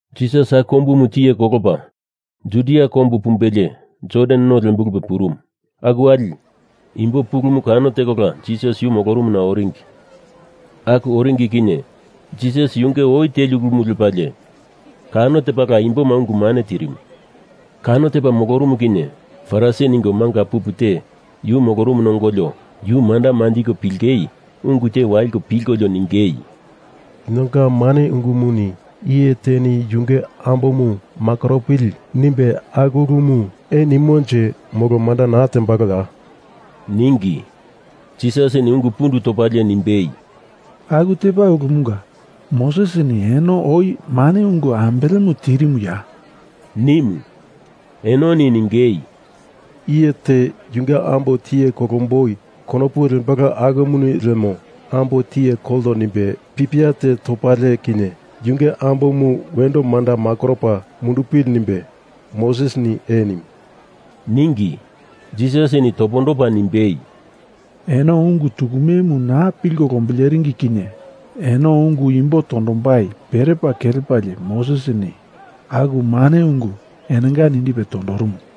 Jisas aku kombumu tiye kolopa Judia kombu pumbelie Jordan no lembulupe purumu. Aku wali, imbo pulumu kano tekola Jisas yu molorumuna oringi. Aku oringi kinye Jisas yunge oi teli ulumu lepalie, kano tepala imboma ungu mane tirimu. Kano tepa molorumu kinye Farisi ningo manga pupu te yu molorumuna ongolio yu manda manjiko pilingei ungu te waliko pilkolio ningei, “Linonga mane ungumuni iye teni yunge ambomu makoropili nimbe aku ulumu ee nimonje molo manda naa tembaloya?” ningi. Jisasini ungu pundu topalie nimbei, “Aku tepa ulumunga, Mosesini eno oi mane ungu ambelemu tirimuya?” nimu. Enoni ningei, “Iye te yunge ambo tiye kolomboi konopu lembalo akumuni lemo ambo tiye kolto nimbe pipia te topalie kinye yunge ambomu wendo manda makoropa mundupili nimbe, Mosesini ee nimu,” ningi. Jisasini topondopa nimbei, “Eno ungu tukumemu naa pilko lombileringi kinye eno ungu imbo tondombai perepa kelepalie Mosesini aku mane ungu enonga nindipe tondorumumu.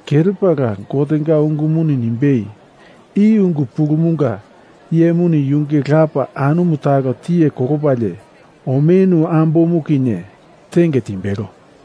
kelepala Gotenga ungumuni nimbei, I ungu pulumunga iyemuni yunge lapa anumu talo tiye kolopalie omenu ambomu kinye tenge timbelo.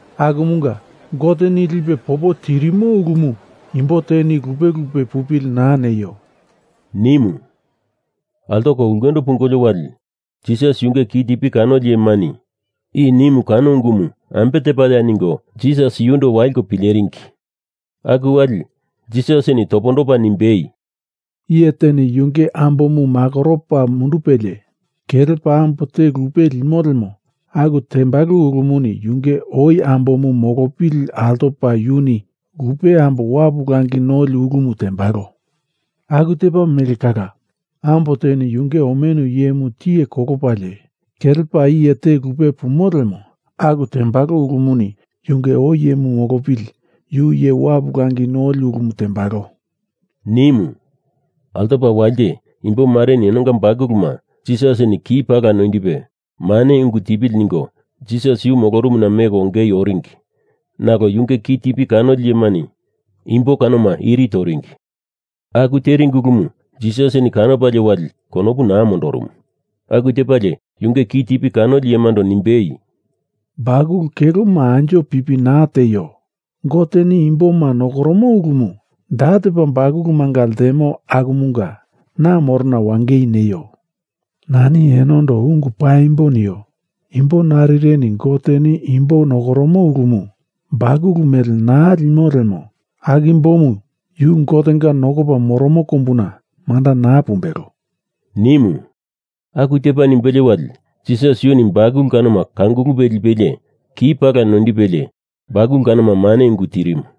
Akumunga Goteni lipe popo tirimo ulumu imbo teni lupe lupe pupili naa neio,” nimu. Altoko ulkendo pungolio wali, Jisas yunge kitipi kanoli iyemani i nimu kano ungumu ambe tepaya ningo Jisas yundo waliko pileringi. Aku wali, Jisasini topondopa nimbei, “Iye teni yunge ambomu makoropa mundupelie, kelepa ambo te lupe limo lemo, aku tembalo ulumuni yunge oi ambomu molopili altopa yuni lupe ambo wapu langi noli ulumu tembalo. Aku tepa mele kala, ambo teni yunge omenu iyemu tiye kolopalie kelepa iye te lupe pumo lemo, aku tembalo ulumuni yunge oi iyemu molopili yu iye wapu langi noli ulumu tembalo,” nimu. Altopa walite imbomareni enonga bakuluma Jisasini ki pala noindipe mane ungu tipili ningo Jisas yu molorumuna meko ongei oringi, nalo yunge kitipi kanoli iyemani imbo kanoma iri toringi. Aku teringi ulumu Jisasini kanopalie wali konopu naa mondorumu. Aku tepalie yunge kitipi kanoli iyemando nimbei, “Bakulu keloma anjo pipi naa tieio. Goteni imboma nokoromo ulumu da tepa bakulumanga ltemo akumunga na morona wangei neio. Nani enondo ungu paimbo nio. Imbo narireni Goteni imbo nokoromo ulumu bakulu mele naa limo lemo, aku imbomu yu Gotenga nokopa moromo kombuna manda naa pumbelo,” nimu. Aku tepa nimbelie wali, Jisas yuni bakulu kanoma kangulupe lipelie ki pala noindipelie bakulu kanoma mane ungu tirimu.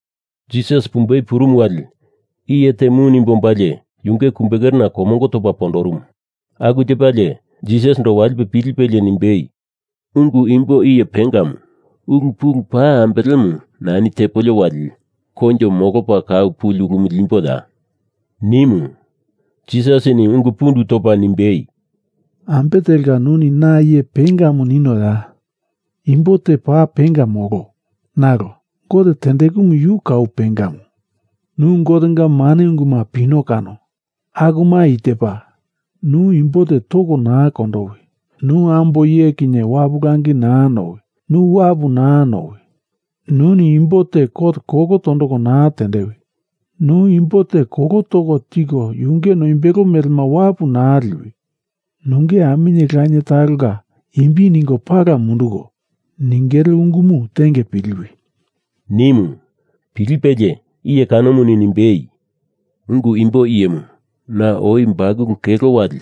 Jisas pumbei purumu wali, iye te mu nimbe ombalie yunge kumbekerena komongo topa pondorumu. Aku tepalie, Jisasindo walipe pilipelie nimbei, “Ungu imbo iye pengamu, ulu pulu paa ambelemu nani tepolio wali, koinjo molopa kau puli ulumu limboya?” nimu. Jisasini ungu pundu topa nimbei, “Ambe telka nuni na iye pengamu ninoya? Imbo te paa penga molo, nalo Gote tendekumu yu kau pengamu. Nu Gotenga mane unguma pino kano, akuma i tepa: Nu imbo te toko naa kondowi. Nu ambo iye kinye wapu langi naa nowi. Nu wapu naa nowi. Nuni imbo te kot kolo tondoko naa tendewi. Nu imbo te kolo toko tiko yunge noimbelo melema wapu naa liwi. Nunge aminye lanie talonga imbi ningo pala munduko ningele ungumu tenge piliwi,” nimu. Pilipelie, iye kanomuni nimbei, “Ungu imbo iyemu, na oi bakulu kelo wali,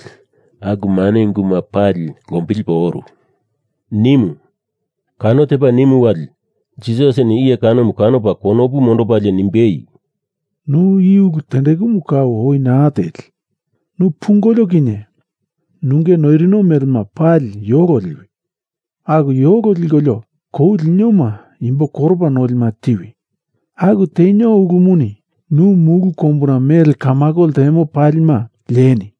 aku mane unguma pali lombilipo oru,” nimu. Kano tepa nimu wali, Jisasini iye kanomu kanopa konopu mondopalie nimbei, “Nu i ulu tendekumu kau oi naa teli. Nu pungolio kinye nunge noirino melema pali yolo liwi. Aku yolo likolio kou linioma imbo koropa nolima tiwi. Aku tenio ulumuni nu mulu kombuna mele kamako ltemo palima lieni.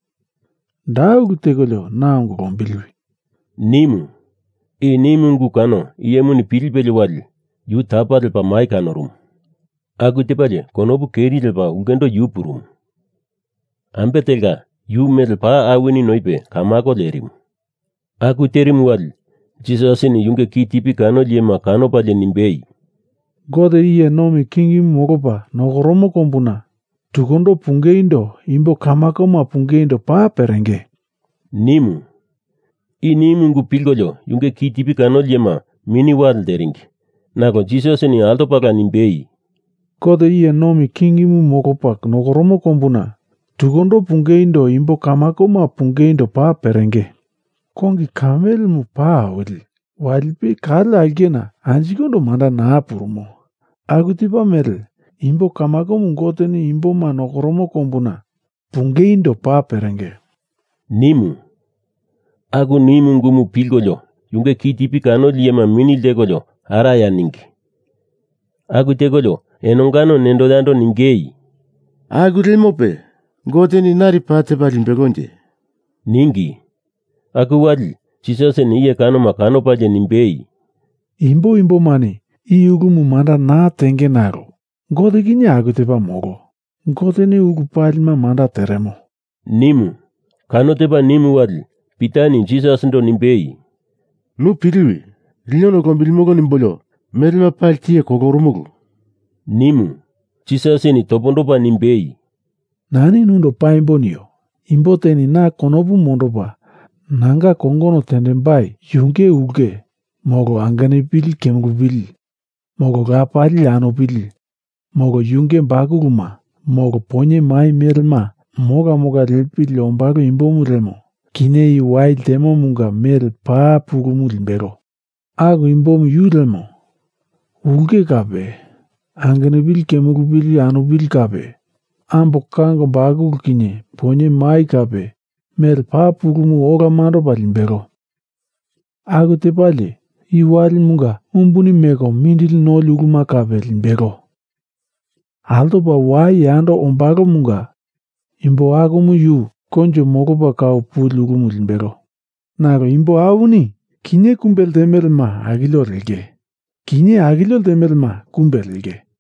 Da ulu tekolio, na ongo lombiliwi,” nimu. I nimu ungumu kano iyemuni pilipelie wali, yu tapa lepa mai kanorumu. Aku tepalie konopu keri lepa ulkendo yu purumu. Ambe telka, yu mele paa awini noipe kamako lerimu. Aku terimu wali, Jisasini yunge kitipi kanoli iyema kanopalie nimbei, “Gote iye nomi kingimu molopa nokoromo kombuna tukundo pungeindo imbo kamakoma pungeindo paa perenge!” nimu. I nimu ungu pilkolio yunge kitipi kanoli iyema mini wale lteringi. Nalo Jisasini altopala nimbei, “Gote iye nomi kingimu molopa nokoromo kombuna tukundo pungeindo imbo kamakoma pungeindo paa perenge. Kongi kamelemu paa awili walipe kale aulkena anjikondo manda naa purumo. Aku tepa mele imbo kamakomu Goteni imboma nokoromo kombuna pungeindo paa perenge,” nimu. Aku nimu ungumu pilkolio yunge kitipi kanoli iyema mini ltekolio araya ningi. Aku tekolio enongano nendo yando ningei, “Aku lemope, Goteni nari paa tepa limbelonje?” ningi. Aku wali, Jisasini iye kanoma kanopalie nimbei, “Imbo imbomani i ulumu manda naa tenge nalo Gote kinye aku tepa molo. Goteni ulu palima manda teremo,” nimu. Kano tepa nimu wali Pitani Jisasindo nimbei, “Nu piliwi, lino nu lombilimili nimbolio melema pali tiye kolorumulu,” nimu. Jisasini topondopa nimbei, “Nani nundo paimbo nio. Imbo teni na konopu mondopa nanga kongono tendembai yunge ulke, molo angenupili kemulupili, molo lapali anupili, molo yunge bakuluma, molo poinye mai melema mola mola lepili ombalo imbomu lemo, kinye i wai ltemomunga mele paa pulumu limbelo. Aku imbomu yu lemo, ulke kape, angenupili kemulupili anupili kape, ambo kango bakulu kinye poinye mai kape, mele paa pulumu ola mandopa limbelo. Aku tepalie, i walimunga umbuni meko mindili noli uluma kape limbelo. Altopa wai yando ombalomunga imbo akumu yu koinjo molopa kau puli ulumu limbelo. Nalo imbo awini kinye kumbe ltemelema akilio lenge. Kinye akilio ltemelema kumbe lenge.”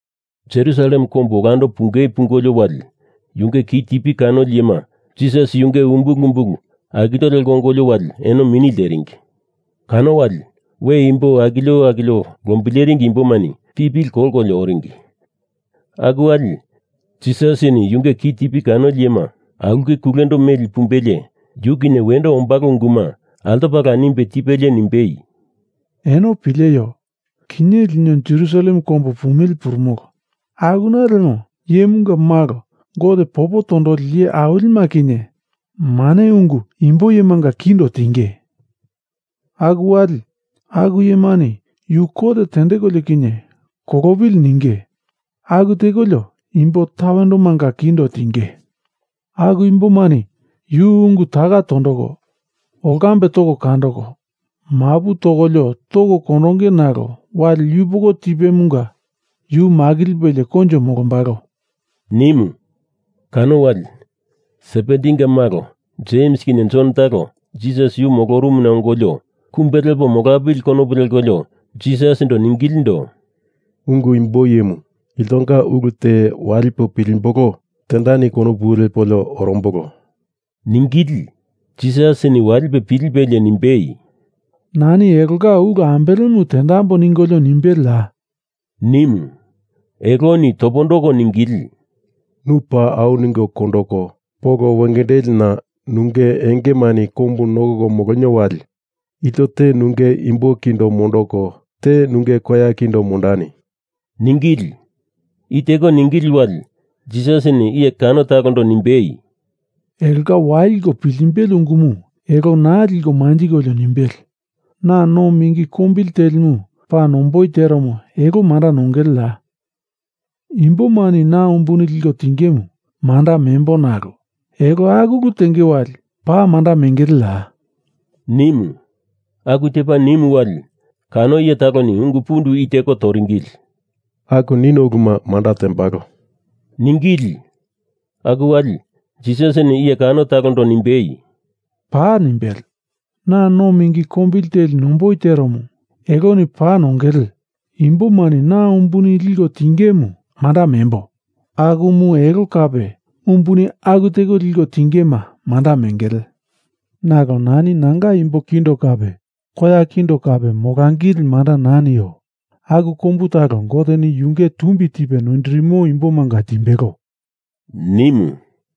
Jerusalem kombu olando pungei pungolio wali, yunge kitipi kanoli iyema Jisas yunge umbulu umbulu akilio leko ongolio wali eno mini lteringi. Kano wali, we imbo akilio akilio lombileringi imbomani pipili kolkolio oringi. Aku wali, Jisasini yunge kitipi kanoli iyema aulke kulendo meli pumbelie yu kinye wendo ombalo unguma altopala nimbetipelie nimbei, “Eno pileio. Kinye lino Jerusalem kombu pumili purumolo, akuna lemo Iyemunga Malo Gote popo tondoli iye awilima kinye mane ungu imbo iyemanga kindo tinge. Aku wali, aku iyemani yu kot tendekolio kinye kolopili ninge aku tekolio imbo tawendomanga kindo tinge. Aku imbomani yu ungu taka tondoko, olkambe toko kandoko mapu tokolio toko kondonge nalo wali yupoko tipemunga yu makilipelie koinjo molombalo,” nimu. Kano wali, Sebedinga malo Jems kinye Jon talo Jisas yu molorumuna ongolio kumbe lepo molambili konopu lepolio Jisasindo ningilindo, “Ungu imbo iyemu, iltonga ulu te walipo pilimbolo tendani konopu lepolio orombolo,” ningili. Jisasini walipe pilipelie nimbei, “Nani elonga ulu ambelemu tendamboi ningolio nimbeleya?” nimu. Eloni topondoko ningili, “Nu paa au ningo kondoko polo wengendelina nunge engemani kombu nokoko molonio wali, ilto te nunge imbo kindo mondoko te nunge koya kindo mondani,” ningili. I teko ningili wali, Jisasini iye kano talondo nimbei, “Elonga waliko piltimbele ungumu elo naa liko manjikolio nimbele. Na no mingi kombili telimu paa nomboi teromu, elo manda nongeleya? Imbomani na umbuni liko tingemu manda membo nalo elo aku ulu tenge wali paa manda mengeleya?” nimu. Aku tepa nimu wali, kano iye taloni ungu pundu i teko toringili, “Aku nino uluma manda tembolo,” ningili. Aku wali, Jisasini iye kano talondo nimbei, “Paa nimbele! Na no mingi kombili teli nomboi teromu eloni paa nongele. Imbomani na umbuni liko tingemu manda membo akumu elo kape umbuni aku teko liko tingema manda mengele. Nalo nani nanga imbo kindo kape koya kindo kape molangili manda naa nio. Aku kombu talo Goteni yunge tumbi tipe noindirimo imbomanga timbelo,” nimu.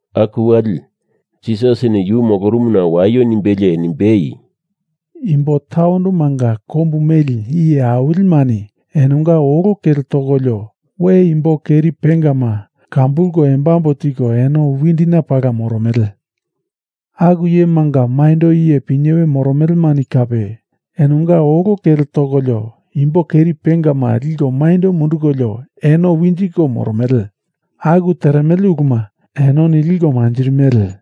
Aku wali, Jisasini yu molorumuna waio nimbelie nimbei, “Imbo tawendomanga kombu meli iye awilimani enonga olo kele tokolio we imbo keri pengama kambulko embambo tiko eno windina pala moromele. Aku iyemanga maindo iye pinyewe moromelemani kape enonga olo kele tokolio imbo keri pengama liko maindo mundukolio eno winjiko moromele. Aku teremele uluma enoni liko manjirimele.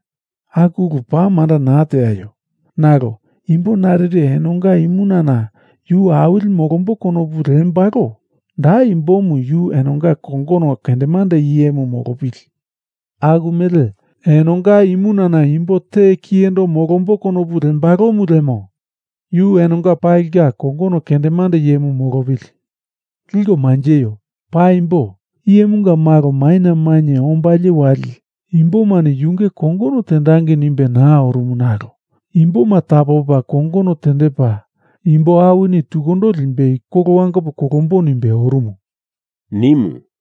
Aku ulu paa manda naa teaio. Nalo imbo narire enonga imunana yu awili molambo konopu lembalo, da imbomu yu enonga kongono kendemande iyemu molopili. Aku mele enonga imunana imbo te kiyendo molombo konopu lembalomu lemo, yu enonga palinga kongono kendemande iyemu molopili. Liko manjeio! Paimbo, Iyemunga Malo maina mainye ombalie wali imbomani yunge kongono tendangei nimbe naa orumu nalo imboma tapopa kongono tendepa imbo awini tukundo limbei kolo wangopo kolombo nimbe orumu,” nimu.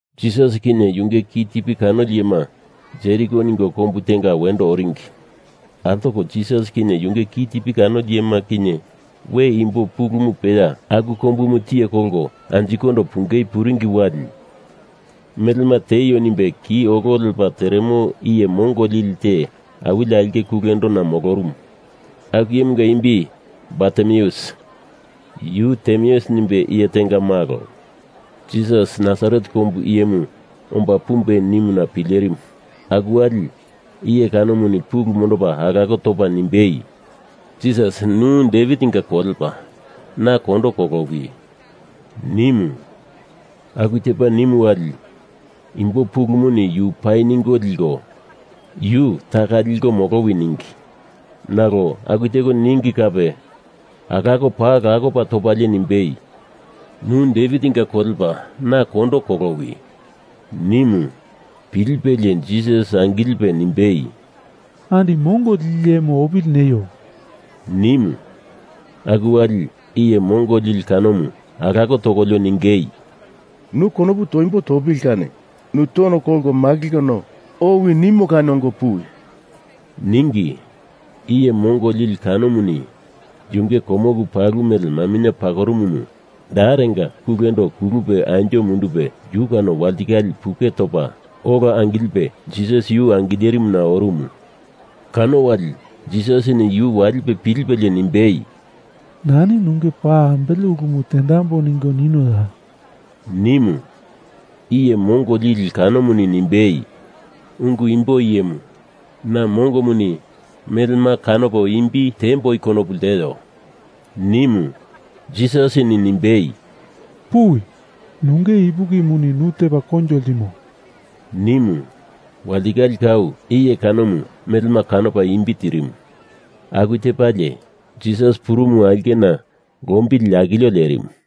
Jisas kinye yunge kitipi kanoli iyema Jeriko ningo kombu tenga wendo oringi. Altoko Jisas kinye yunge kitipi kanoli iyema kinye we imbo pulumu peya aku kombumu tiye kolko anjikondo pungei puringi wali, melema tieio nimbe ki olo lepa teremo iye mongo lili te awili aulke kulendona molorumu. Aku iyemunga imbi Bartimeus, yu Timeus nimbe iye tenga malo. Jisas Nasaret kombu iyemu omba pumbe nimuna pilerimu. Aku wali, iye kanomuni pulu mondopa alako topa nimbei, “Jisas nu Devitinga kolepa, na kondo kolowi,” nimu. Aku tepa nimu wali, imbo pulumuni yu pai ningo likolio, yu taka liko molowi ningi. Nalo aku teko ningi kape alako paa lakopa topalie nimbei, “Nu Devitinga kolepa, na kondo kolowi,” nimu. Pilipelie Jisas angilipe nimbei, “Andi mongo lili iyemu opili neio!” nimu. Aku wali, iye mongo lili kanomu alako tokolio ningei, “Nu konopu toimbo topili kani, nu tono kolko makilkono owi nimo kani ongo puwi!” ningi. Iye mongo lili kanomuni yunge komoku palu mele maminye pakorumumu darenga kulendo kulupe anjo mundupe yu kano walitikale puke topa ola angilipe Jisas yu angilerimuna orumu. Kano wali, Jisasini yu walipe pilipelie nimbei, “Nani nunge paa ambele ulumu tendamboi ningo ninoya?” nimu. Iye mongo lili kanomuni nimbei, “Ungu imbo iyemu, na mongomuni melema kanopo imbi tiemboi konopu lteo,” nimu. Jisasini nimbei, “Puwi. Nunge ipukimuni nu tepa koinjo ltimo,” nimu. Walitikale kau iye kanomu melema kanopa imbi tirimu. Aku tepalie, Jisas purumu aulkena lombili akilio lerimu.